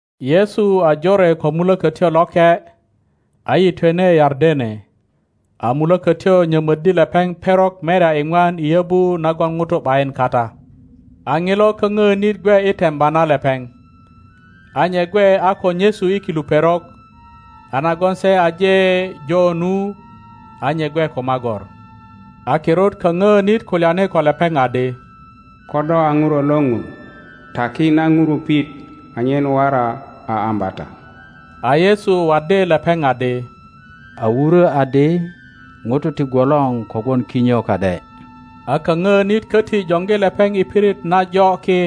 Yesu a jore ko Mulökötyo Loke, a yitwene Yardene, a Mulökötyo nyomoddi lepeŋ perok merya iŋwan i yobu nagon ŋutu ’bayin kata, a Ŋilo kaŋ ŋonit gwe i temba na lepeŋ. A nye gwe a ko nyesu i kilu perok, a nagon se aje jo nu, a nye gwe ko magor. A kirut kaŋŋonit kulyani ko lepeŋ adi, Ko do a Ŋuro lo Ŋun, taki na ŋurupit anyen wora a ambata. a Yesu waddi lepeŋ adi, A wuro adi, Ŋuto ti gwolor kogwon kinyo ka ’de. A kaŋöönit köti joŋgi lepeŋ i pirit najo ki,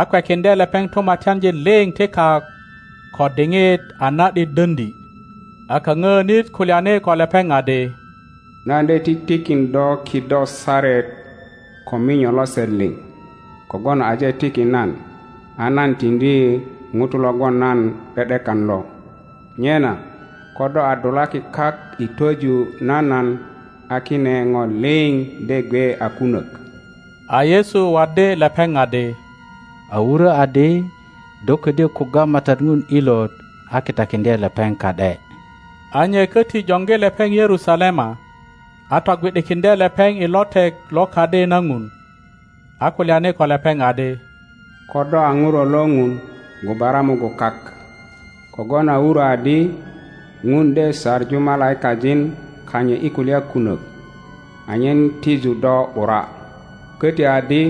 a kwekiŋdye lepeŋ tumatyanjin liŋ ti kak ko diŋit a na ’dit döŋdi. A kaŋöönit kulyani ko lepeŋ adi, Nan de titikin do kido saret ko minyo lose liŋ, kogwon aje tiki nan, a nan tiŋdi ŋuto logon nan ’de ’dekan lo. Nyena ko do a dulaki kak i twoju na nan a kine ŋo liŋ de gwe a kunok. A Yesu waddi lepeŋ adi, A wurö adi, Do ködyö kugga MATAT Ŋun ilot a kitakiŋdye lepeŋ ka ’de. A nye koti joŋgi lepeŋ Yerusalema, a togwi ’dikiŋdye lepeŋ i lotek lo Kadi na Ŋun, a kulyani ko lepeŋ adi, Ko do a ŋuro lo Ŋun, gubara mugun kak; kogwon a wuro adi, Ŋun de saŋu malaikajin kanyit i kulya kunök anyen tiju do ’bura, köti adi,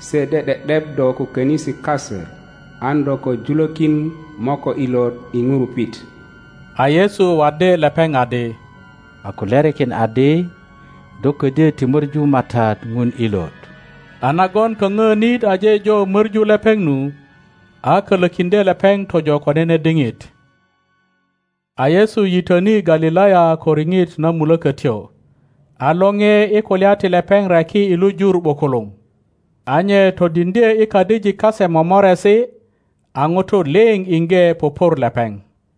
Se de ’de ’dep do ko konisi kase an do ko julökin moköt ilot i ŋurupit. A Yesu waddi lepeŋ adi, A kulyarikin adi, Do ködyö ti möŋu MATAT Ŋun ilot. A nogon kaŋŋonit aje jo möŋu lepeŋ nu, a kölökiŋdye lepeŋ tojo ko nene diŋit. A Yesu yitöni Galilaya ko riŋit na Mulökötyo, a lore i kulya ti lepeŋ reki i lu jur ’bukuluŋ. A nye todiŋdye i kadijik kase momoresi, a ŋutu liŋ iŋge pupur lepeŋ.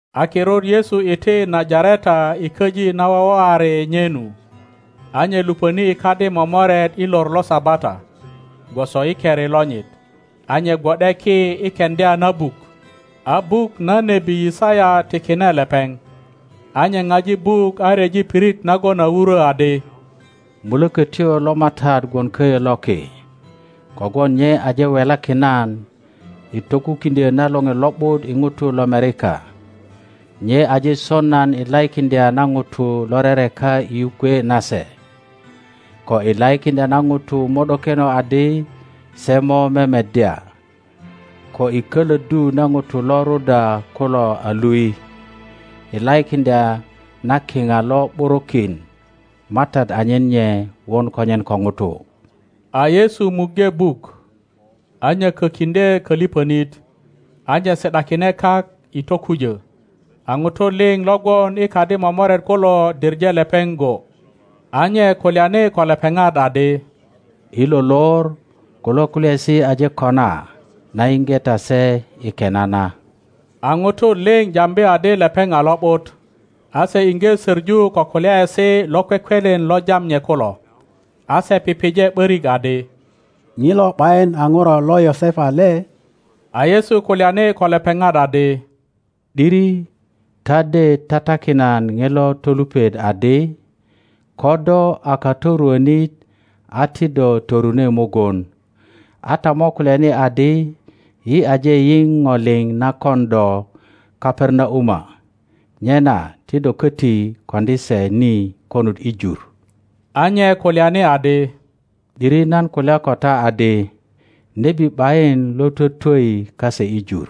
A kirut Yesu iti Najareta i köji na wowoari nye nu. A nye luponi i kadi momoret i lor lo Sabata, gwoso i keri lonyit, a nye gwo ’de ki i keŋdya na buk. A buk na nebi Yisaya tikine lepeŋ. A nye ŋaji buk a ryeji pirit nagon a wuro adi, Mulökötyo lo MATAT gwon koyo loki, kogwon nye aje welakin nan i tokukiŋdyo na lore lo ’but i ŋutu lomerika, nye aje son nan i laikiŋdya na ŋutu lo rereka i yukwe nase, ko i laikiŋdya na ŋutu mo ’dokeno adi se mo memeddya ko i köloddu na ŋutu lo ruda kulo a lui, i laikiŋdya na kiŋa lo ’burukin MATAT anyen nye won konyen ko ŋutu. A Yesu muŋge buk, a nyökokiŋdye koliponit, a nye si ’dakine kak i tokujo; a ŋutu liŋ lo gwon i kadi momoret kulo diŋe lepeŋ go. A nye kulyani ko lepeŋat adi, I lo lor kulo kulyaesi aje kona na yiŋge ta se i kena na. a ŋutu liŋ jambi adi lepeŋ a lo ’but, a se iŋge söŋu ko kulyaesi lokwekwelen lo jam nye kulo. A se pije ’börik adi, ŋilo ’bayin a ŋuro lo Yosepa le? a Yesu kulyani ko lepeŋat adi, ’Diri ta de tatakin nan ŋilo tolupet adi, Ko do a katoruonit a ti do torune mugun, a ta mo kulyani adi, Yi aje yiŋ ŋo liŋ na kon do Kaperanauma, nyena ti do koti koŋdi se ni konut i jur. a nye kulyani adi, ’Diri nan kulya ko ta adi, Nebi ’bayin lo twotwoi kase i jur.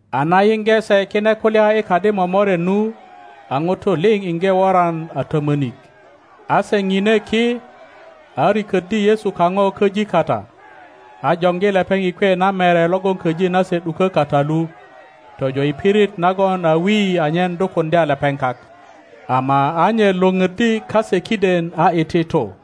a na yiŋge se kine kulya i kadi momoret nu, a ŋutu liŋ iŋge woran a tomonik. a se ŋine ki, a rikoddi Yesu kaŋo köji kata, a joŋgi lepeŋ i kwe na mere logon köji nase ’duko kata lu, tojo i pirit nagon a wi anyen dukuŋdya lepeŋ kak; ama a nye Iwoŋoddi kase kiden a iti tu.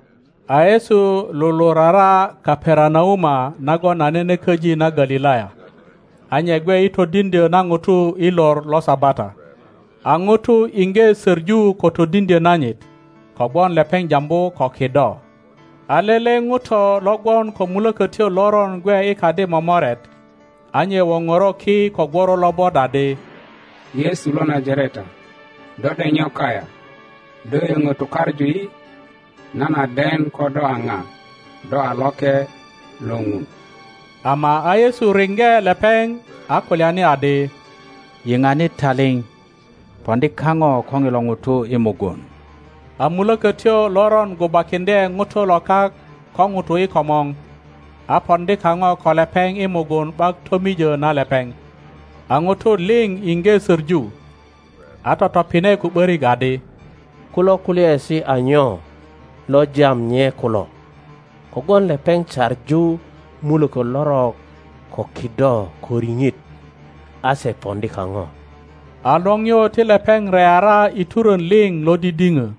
A Yesu lulurara Kaperanauma nagon a nene köji na Galilaya, a nye gwe i todiŋdyo na ŋutu i lor lo Sabata. A ŋutu iŋge söŋu ko todiŋdyo nanyit, kogwon lepeŋ jambu ko kido. A lele ŋuto lo gwon ko mulökötyo loron gwe i kadi momoret, a nye woŋoro ki ko gworo lobot adi, Yesu lo Najareta, do ’dek nyo kayaŋ? Do yoŋo tukaŋu yi? Nan a den ko do a ŋa, do a Loke lo Ŋun. Ama a Yesu riŋge lepeŋ, a kulyani adi, Yiŋani taliŋ, poŋdi kaŋo ko ŋilo ŋuto i mugun! A mulokotyo loron gubakiŋdye ŋuto lo kak ko ŋutu i komor, a poŋdi kaŋo ko lepeŋ i mugun ’bak tomijo na lepeŋ. a ŋutu liŋ iŋge söŋu, a totopine ko ’börik adi, Kulo kulyaesi a nyo lo jam nye kulo? Kogwon lepeŋ saŋu muloko lorok ko kido ko riŋit, a se poŋdi kaŋo. A liŋio ti lepeŋ reara i turon liŋ lo didiŋo.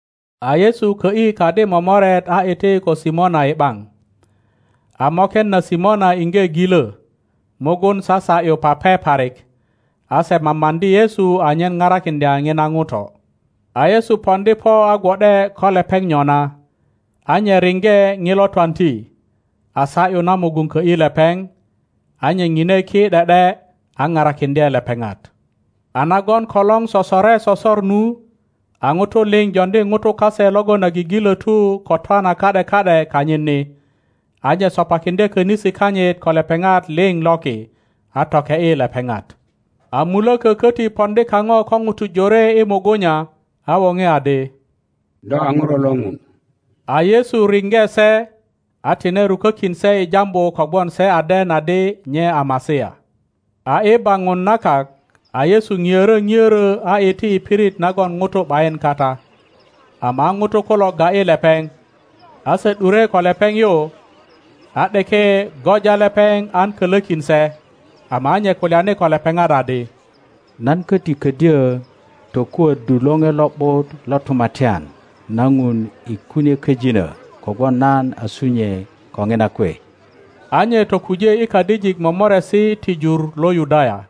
A Yesu kö ’yi kadi momoret a iti ko Simona i ’baŋ. A moken na Simona iŋge gilo, mugun sasa ’yu pape parik, a se mamaŋdi Yesu anyen parakiŋdya ŋina ŋuto. a Yesu poŋdi po a gwo ’de ko lepeŋ nyona, a nye riŋge ŋilo twanti, a sa ’yu na mugun kö ’yi lepeŋ; a nye ŋine ki ’de ’de a parakiŋdye lepeŋat. A nagon kolor sosore sosor nu, a ŋutu liŋ joŋdi ŋutu kase logon a gigilotu ko twana ka ’de ka ’de kanyit ni; a nye sopakiŋdye konisi kanyit ko lepeŋat liŋ loki, a toke ’yi lepeŋat. A muloko köti poŋdi kaŋo ko ŋutu jore i mugunya, a woŋe adi, Do a ŋuro lo Ŋun! A Yesu riŋge se, a tine rukokin se i jambu kogwon se a den adi nye a Masia. A i baŋun na kak, a Yesu ŋiörö ŋioro a iti i pirit nagon ŋutu ’bayin kata. Ama a ŋutu kulo ga ’yi lepeŋ, a se ’dure ko lepeŋ yu, a ’deke göja lepeŋ an kolokin se; ama a nye kulyani ko lepeŋat adi, Nan köti kodyo tokuoddu lore lo ’but lo tumatyan na Ŋun i kunie köjinö, kogwon nan a sunyue ko ŋina kwe. A nye tokuje i kadijik momoresi ti jur lo Yudaya.